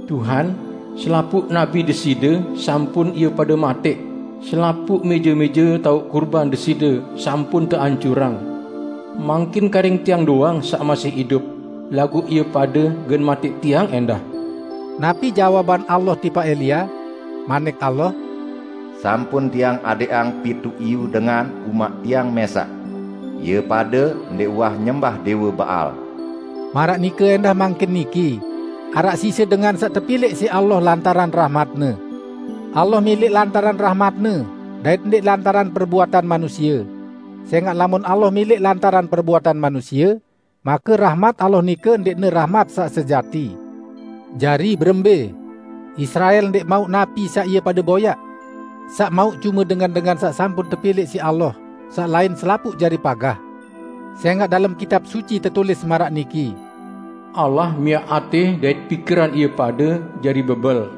"Tuhan, selapuq nabi Deside sampun ie pade matẽq, selapuq mẽje-mẽje taoq kurban Deside sampun teancurang. Mangkin karing tiang doang saq masih idup, laguq ie pade gen matẽq tiang ẽndah." Napi jawaban Allah tipaq Elia? Manik Allah, "Sampun Tiang adẽqang pituq iyu dengan umaq Tiang mẽsaq. Ie pade ndẽq uwah nyembah Dẽwe Baal." Maraq nike ẽndah mangkin niki: Araq sise dengan saq tepilẽq siq Allah lantaran rahmat-Ne. Allah milẽq lantaran rahmat-Ne, dait ndẽq lantaran perbuatan manusie; sẽngaq lamun Allah milẽq lantaran perbuatan manusie, make rahmat Allah nike ndẽqne rahmat saq sejati. Jari, berembẽ? Israel ndẽq mauq napi saq ie pade boyaq. Saq mauq cume dengan-dengan saq sampun tepilẽq siq Allah, saq lain selapuq jari pagah. Sẽngaq dalem Kitab Suci tetulis maraq niki, "Allah miaq atẽ dait pikiran ie pade jari bebel;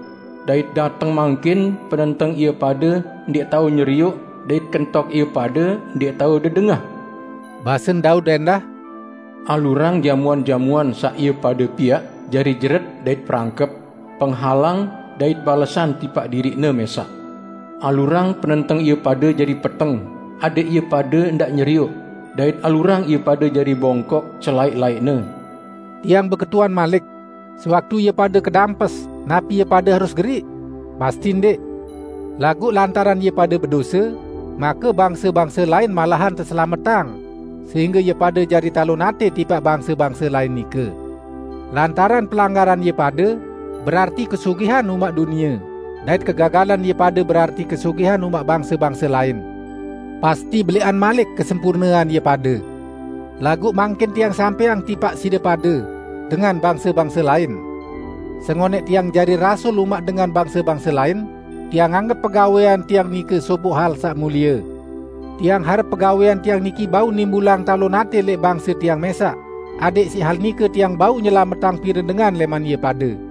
dait dateng mangkin penenteng ie pade ndẽq tao nyerioq dait kentok ie pade ndẽq tao dedengah." Basen Daud ẽndah, "Alurang jamuan-jamuan saq ie pade piaq jari jeret dait perangkep, penghalang dait balesan tipaq diriqne mẽsaq. Alurang penenteng ie pade jari peteng adẽq ie pade ndaq nyerioq; dait alurang ie pade jari bongkok selaẽq-laẽqne." Tiang beketuan malik: Sewaktu ie pade kedampes, napi ie pade harus geriq? Pasti ndẽq! Laguq lantaran ie pade bedose, make bangse-bangse lain malahan teselametang, sehingge ie pade jari talon atẽ tipaq bangse-bangse lain nike. Lantaran pelanggaran ie pade berarti kesugihan umaq dunie, dait kegagalan ie pade berarti kesugihan umaq bangse-bangse lain; pasti belẽqan malik kesempurnean ie pade. Laguq mangkin tiang sampẽang tipaq side pade, dengan bangse-bangse lain! Sengonẽq tiang jari rasul umaq dengan bangse-bangse lain, tiang anggep pegawẽan tiang nike sopoq hal saq mulie. Tiang harep pegawẽan tiang niki bau nimbulang talon atẽ lẽq bangse tiang mẽsaq, adẽq siq hal nike tiang bau nyelametang pire dengan lẽman ie pade.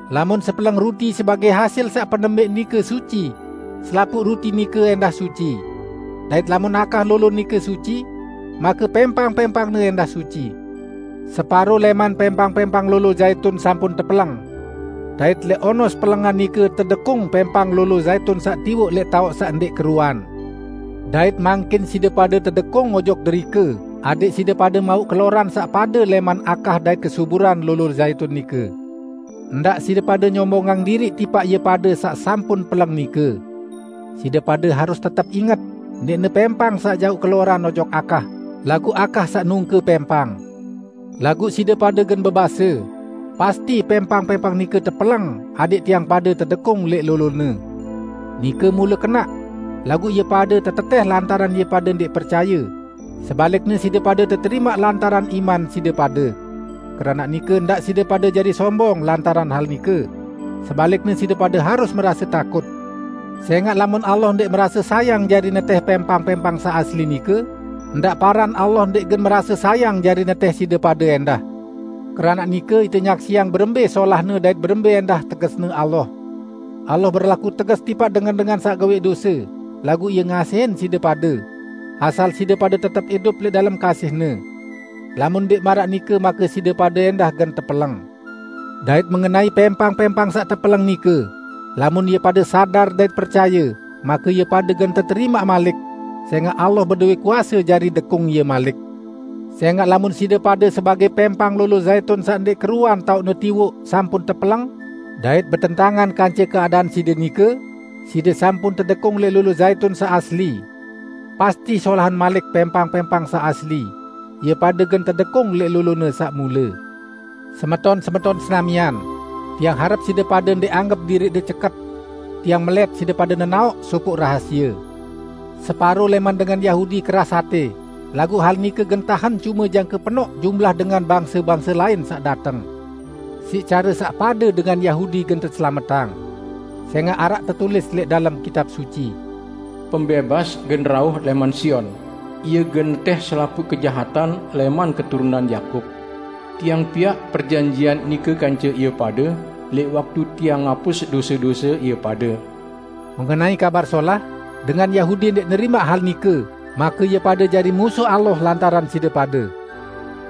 Lamun sepeleng ruti sebagẽ hasil saq penembẽq nike suci, selapuq ruti nike ẽndah suci. Dait lamun akah lolo nike suci, make pẽmpang-pẽmpangne ẽndah suci. Separo lẽman pẽmpang-pẽmpang lolo zaitun sampun tepeleng. Dait lẽq onos pelengan nike tedekung pẽmpang lolo zaitun saq tiwoq lẽq taoq saq ndẽq keruan. Dait mangkin side pade tedekung ojok derike adẽq side pade mauq keloran saq pade lẽman akah dait kesuburan lolo zaitun nike. Ndaq side pade nyombongang diriq tipaq ie pade saq sampun peleng nike. Side pade harus tetep inget, ndẽqne pẽmpang saq jauq keloran ojok akah, laguq akah saq nungke pẽmpang. Laguq side pade gen bebase, "Pasti, pẽmpang-pẽmpang nike tepeleng adẽq tiang pade tedekung lẽq lolone!" Nike mule kenaq. Laguq ie pade tetetẽh lantaran ie pade ndẽq percaye, sebalikne side pade teterimaq lantaran iman side pade. Keranaq nike ndaq side pade jari sombong lantaran hal nike; sebalikne side pade harus merase takut. Sẽngaq lamun Allah ndẽq merase sayang jari netẽh pẽmpang-pẽmpang saq asli nike, ndaq paran Allah ndẽq gen merase sayang jari netẽh side pade ẽndah! Keranaq nike, ite nyaksiang berembẽ solahne dait berembẽ ẽndah tegesne Allah. Allah berlaku teges tipaq dengan-dengan saq gawẽq dose, laguq Ie ngasihin side pade -- asal side pade tetep idup lẽq dalem kasih-Ne. Lamun ndẽq maraq nike, make side pade ẽndah gen tepeleng. Dait mengenai pẽmpang-pẽmpang saq tepeleng nike, lamun ie pade sadar dait percaye, make ie pade gen teterimaq malik; sẽngaq Allah bedowẽ kuase jari dekung ie malik. Sẽngaq lamun side pade sebagẽ pẽmpang lolo zaitun saq ndẽq keruan taoqne tiwoq sampun tepeleng, dait betentangan kance keadaan side nike, side sampun tedekung lẽq lolo zaitun saq asli. Pasti solahan malik pẽmpang-pẽmpang saq asli, ie pade gen tedekung lẽq lolone saq mule. Semeton-semeton senamian! Tiang harep side pade ndẽq anggep diriqde ceket. Tiang melẽt side pade nenaoq sopoq rahasie: Separo lẽman dengan Yahudi keras atẽ laguq hal nike gen tahen cume jangke penoq jumlah dengan bangse-bangse lain saq dateng. Siq care saq pade dengan Yahudi gen teselametang. Sẽngaq araq tetulis lẽq dalem Kitab Suci, "Pembẽbas gen rauh lẽman Sion; Ie gen netẽh selapuq kejahatan lẽman keturunan Yakub. Tiang piaq perjanjian nike kance ie pade lẽq waktu Tiang ngapus dose-dose ie pade." Mengenai Kabar Solah, dengan Yahudi ndẽq nerimaq hal nike, make ie pade jari musuh Allah lantaran side pade;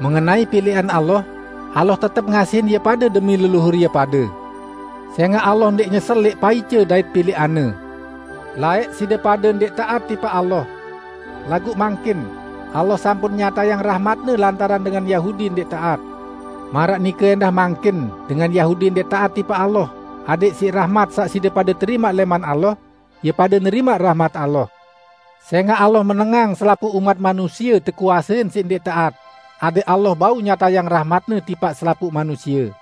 mengenai pilẽqan Allah, Allah tetep ngasihin ie pade demi leluhur ie pade. Sẽngaq Allah ndẽq nyesel lẽq paice dait pilẽqan-Ne. Laẽq, side pade ndẽq taat tipaq Allah. Laguq mangkin, Allah sampun nyatayang rahmat-Ne lantaran dengan Yahudi ndẽq taat. Maraq nike ẽndah mangkin dengan Yahudi ndẽq taat tipaq Allah adẽq siq rahmat saq side pade terimaq lẽman Allah, ie pade nerimaq rahmat Allah. Sẽngaq Allah menengang selapuq umat manusie tekuasein siq ndẽq taat, adẽq Allah bau nyatayang rahmat-Ne tipaq selapuq manusie.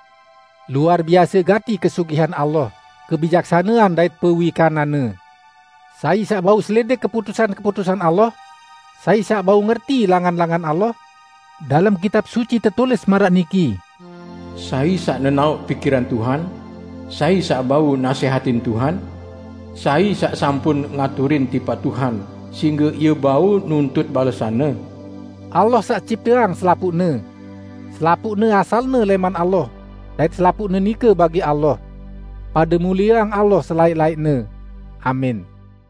Luar biase gati kesugihan Allah, kebijaksanean dait pewikanan-Ne! Sai saq bau selidik keputusan-keputusan Allah? Sai saq bau ngerti langan-langan Allah? Dalem Kitab Suci tetulis maraq niki, "Sai saq nenaoq pikiran Tuhan? Sai saq bau nasẽhatin Tuhan? Sai saq sampun ngaturin tipaq Tuhan sehingge ie bau nuntut balesan-Ne?" Allah saq cipteang selapuqne. Selapuqne asalne lẽman Allah, dait selapuqne nike bagi Allah. Pade mulieang Allah selaẽq-laẽqne! Amin.